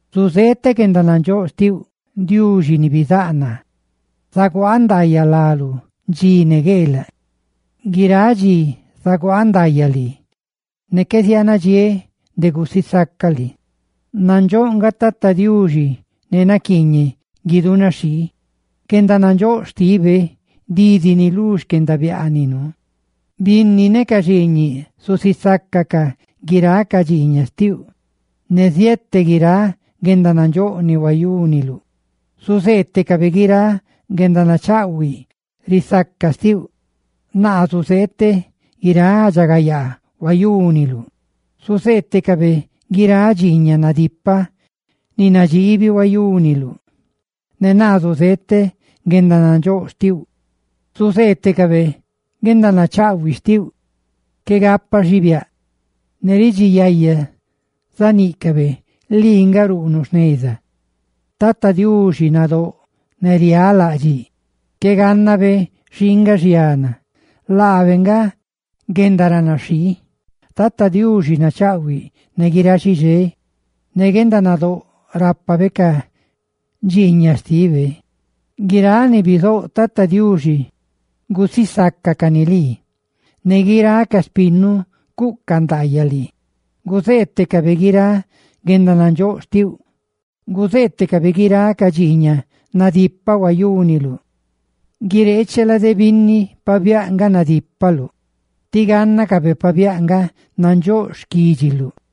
Zuzeeteꞌ guendanandxóꞌ xtiuꞌ, Diuxi ne Xaique xtinneꞌ; zaguaaꞌ ndaayaꞌ láluꞌ dxi ne gueelaꞌ. Guiráꞌ dxi zaguaaꞌ ndaayaꞌ lii; ne qué zianadxiéꞌ de gusisacaꞌ lii. Nandxóꞌ nga Tata Diuxi ne naquiiñeꞌ guidunaxhii; guendanandxóꞌ xtibe didi ni lú xquendabiaaninu. Binni ne ca xiiñiꞌ zusisácacaꞌ guiráꞌ ca dxiiñaꞌ xtiuꞌ, ne ziete guiráꞌ guendanandxóꞌ ni huayúniluꞌ. Zuzeetecabe guiráꞌ guendanachaꞌhuiꞌ risaca xtiuꞌ, naa zuzeeteꞌ guiráꞌ guendaridxagayaa huayúniluꞌ. Zuzeetecabe guiráꞌ dxiiñaꞌ nadipaꞌ ne nadxiibi huayúniluꞌ, ne naa zuzeeteꞌ guendanandxóꞌ xtiuꞌ. Zuzeetecabe guendanachaꞌhuiꞌ xtiuꞌ qué gapa xibiáꞌ, ne ridxi yaya zaníꞌcabe lii nga ruꞌnuꞌ jneza. Tata Diuxi nadóꞌ ne riálaꞌdxiꞌ, qué gannabe xii nga xiana, laabe nga guendaranaxhii. Tata Diuxi nachaꞌhuiꞌ ne guiráꞌ xixé, ne guendanadóꞌ rápabe ca dxiiñaꞌ xtibe. ¡Guiráꞌ ni bizouꞌ, Tata Diuxi, gusisácacani lii! ¡Ne guiráꞌ ca xpinnuꞌ, cuꞌcaꞌ ndaayaꞌ lii! ¡Guzeetecabe guiráꞌ guendanandxóꞌ xtiuꞌ! ¡Guzeetecabe guiráꞌ ca dxiiñaꞌ nadipaꞌ huayúniluꞌ! ¡Guireeche lade binni pabiáꞌ nga nadípaluꞌ tí gánnacabe pabiáꞌ nga nandxóꞌ xquídxiluꞌ!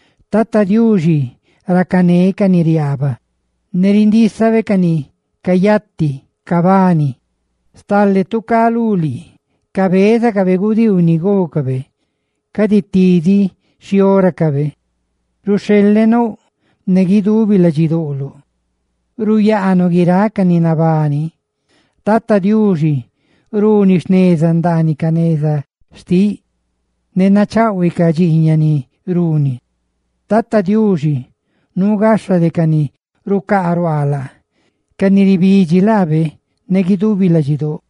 Tata Diuxi racané ca ni riaba, ne rindísabe ca ni cayati cabani. Stale tu cá lú lii cabézacabe gudiiu ni gócabe, cadi tidiꞌ xhióracabe. Ruxheleꞌ nouꞌ, ne guidubi ladxidoꞌloꞌ ruyaanuꞌ guiráꞌ ca ni nabani. Tata Diuxi runi jneza ndaaniꞌ ca neza xtiꞌ, ne nachaꞌhuiꞌ ca dxiiñaꞌ ni runi. Tata Diuxi nuu gaxha de ca ni rucaaruaa laabe, ca ni ribidxi laabe ne guidubi ladxidóꞌ.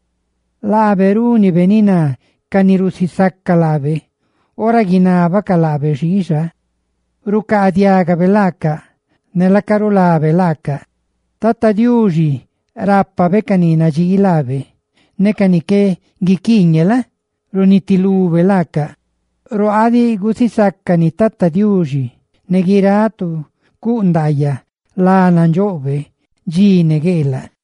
Laabe rúnibe ni ná ca ni rusisaca laabe; ora guinábacaꞌ laabe xiixa, rucaadiagabe laacaꞌ ne laaca rulabe laacaꞌ. Tata Diuxi rápabe ca ni nadxii laabe, ne ca ni qué guiquiiñe la? runitilube laacaꞌ. ¡Ruaaꞌ diꞌ gusisácani Tata Diuxi! ¡Ne guiráꞌ tu cuꞌ ndaayaꞌ lá nandxoꞌbe, dxi ne gueelaꞌ!